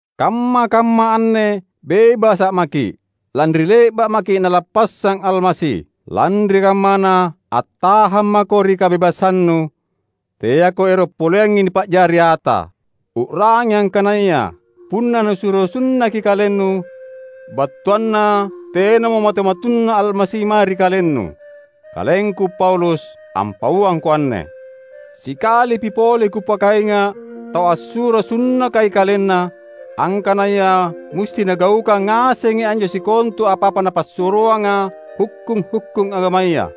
Kamma-kamma anne bebasa’ maki’, lanri le’ba’ maki’ Nalappassang Almasi! Lanri kammana, attahang mako ri kabebasannu; teako ero’ poleangngi nipa’jari ata. U’rangi angkanaya punna nusuro sunnaki kalennu, battuanna tenamo matu-matunna Almasi mae ri kalennu. Kalengku Paulus, ampauangko anne. Sikalipi pole kupakainga’ tau assuro sunnakai kalenna, angkanaya musti nagaukang ngasengi anjo sikontu apa-apa napassuroanga hukkung-hukkung agamaya!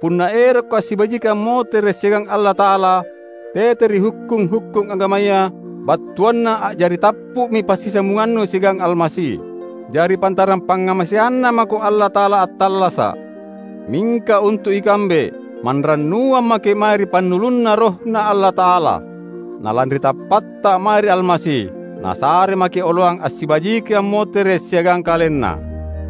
Punna erokko assibajiki ammotere’ siagang Allata’ala tete ri hukkung-hukkung agamaya, battuanna a’jari tappu’mi passisambungannu siagang Almasi. Jari pantarang pangngamaseanNa mako Allata’ala attallasa’. Mingka untu’ ikambe, manrannuang maki’ mae ri pannulunNa RohNa Allata’ala; na lanri tappatta mae ri Almasi, Nasare maki’ oloang assibajiki ammotere’ siagang KalenNa.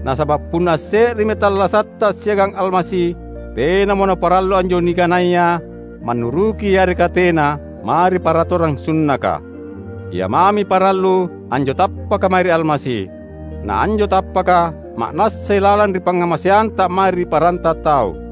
Nasaba’ punna asse’remi tallasatta siagang Almasi, tenamo naparallu anjo nikanaya mannuruki yareka tena, mae ri paratorang sunnaka. Ia mami parallu anjo tappaka mae ri Almasi; na anjo tappaka ma’nassai lalang ri pangngamaseanta mae ri paranta tau.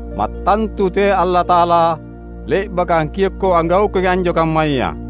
Mattantu teai Allata’ala le’baka angkiokko anggaukangi anjo kammaya!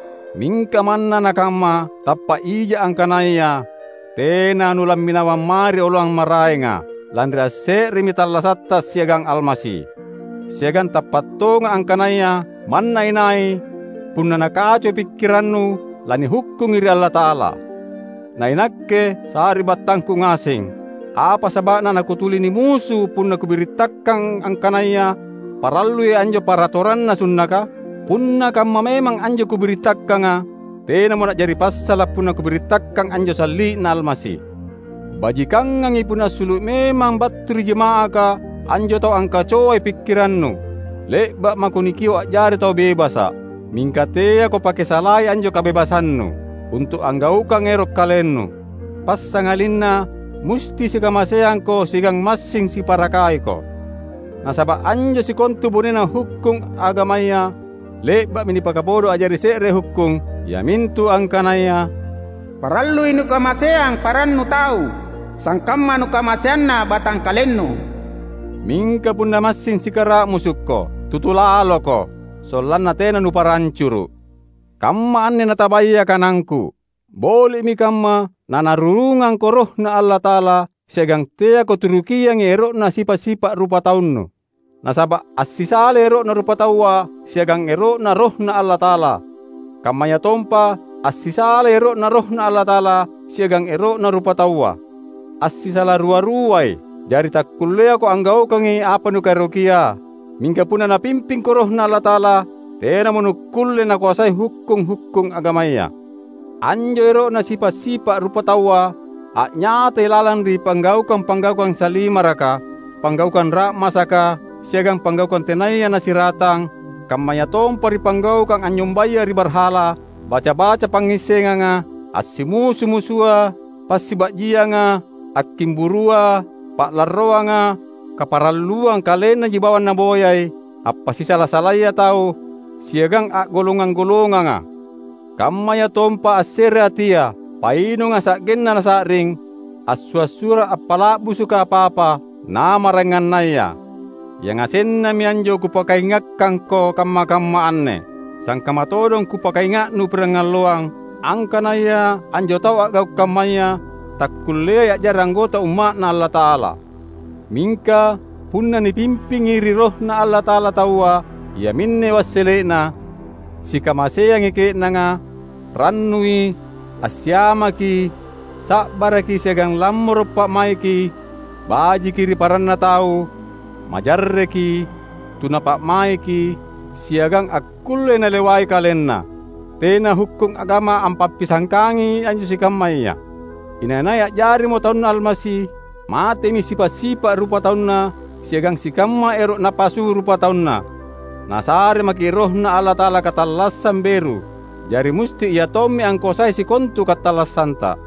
Mingka manna nakamma, tappa’ ija’ angkanaya tena nulamminawang mae ri oloang maraenga, lanri asse’remi tallasatta siagang Almasi. Siagang tappa’ tonga’ angkanaya manna inai, punna nakacoi pikkirannu lanihukkungi ri Allata’ala. Na inakke, sari’battangku ngaseng, apa saba’na nakutuli nimusu punna kubirittakang angkanaya parallui anjo paratoranna sunnaka? Punna kamma memang anjo kubirittakanga, tenamo na’jari passala’ punna kubirittakang anjo Salli’Na Almasi. Bajikangangi punna assulu’ memang battu ri jama’aka anjo tau angkacoai pikkirannu! Le’ba’ mako nikio’ a’jari tau bebasa’. Mingka teako pake salai anjo kabebasannu, untu’ anggaukang ero’ kalennu. Passangalinna musti sikamaseangko siagang massing siparakaiko. Nasaba’ anjo sikontu bonena hukkung agamaya le’ba’mi nipakabodo a’jari se’re hukkung, iamintu angkanaya, "Parallui nukamaseang parannu tau sangkamma nukamaseanna batangkalennu." Mingka punna massing sikara’musukko, tutu laloko, sollanna tena nupara ancuru’. Kamma anne natabaya kanangku: Boli’mi kamma naNarurungangko RohNa Allata’ala; siagang teako turukiangi ero’na sipa’-sipa’ rupataunu. Nasaba’ assisalai ero’na rupataua siagang ero’Na RohNa Allata’ala; kammayatompa assisalai ero’Na RohNa Allata’ala siagang ero’na rupataua. Assisala rua-ruai; jari takkulleako anggaukangi apa nukaerokia. Mingka punna Napimpingko RohNa Allata’ala, tenamo nukkulle nakoasai hukkung-hukkung agamaya. Anjo ero’na sipa’-sipa’ rupataua a’nyatai lalang ri panggaukang-panggaukang salimaraka, panggaukang ra’masaka, siagang panggaukang tenaya nasiratang; kammayatompa ri panggaukang anynyombaya ri barhala, baca-baca pangngissenganga; assimusu-musua, passiba’jianga, akkimburua, pa’larroanga, kaparalluang kalennaji bawang naboyai, appasisala-salaya tau, siagang a’golongang-golonganga; kammayatompa assereatia, painunga sa’genna nasa’ring, assua’-suara’ appala’busuka apa-apa, na maraengannaya. Yangasennami anjo kupakaingakkangko kamma-kamma anne; sangkamma todong kupakainga’nu pirangalloang, angkanaya anjo tau a’gau’ kammaya takkulleai a’jari anggota Umma’Na Allata’ala. Mingka, punna nipimping ri RohNa Allata’ala taua, iaminne wassele’na: sikamaseangi ke’nanga, rannui, assiamaki, sa’baraki siagang lammoro’ pa’maiki, bajiki ri paranna tau, majarreki, tuna pa’maiki, siagang akkullei nalewai kalenna. Tena hukkung agama ampappisangkangi anjo sikammaya. Inai-nai a’jarimo taunNa Almasi, matemi sipa’-sipa’ rupatauna siagang sikamma ero’ napasu rupatauna. Nasare maki’ RohNa Allata’ala katallassang beru; jari musti Ia tommi angkoasai sikontu katallassanta.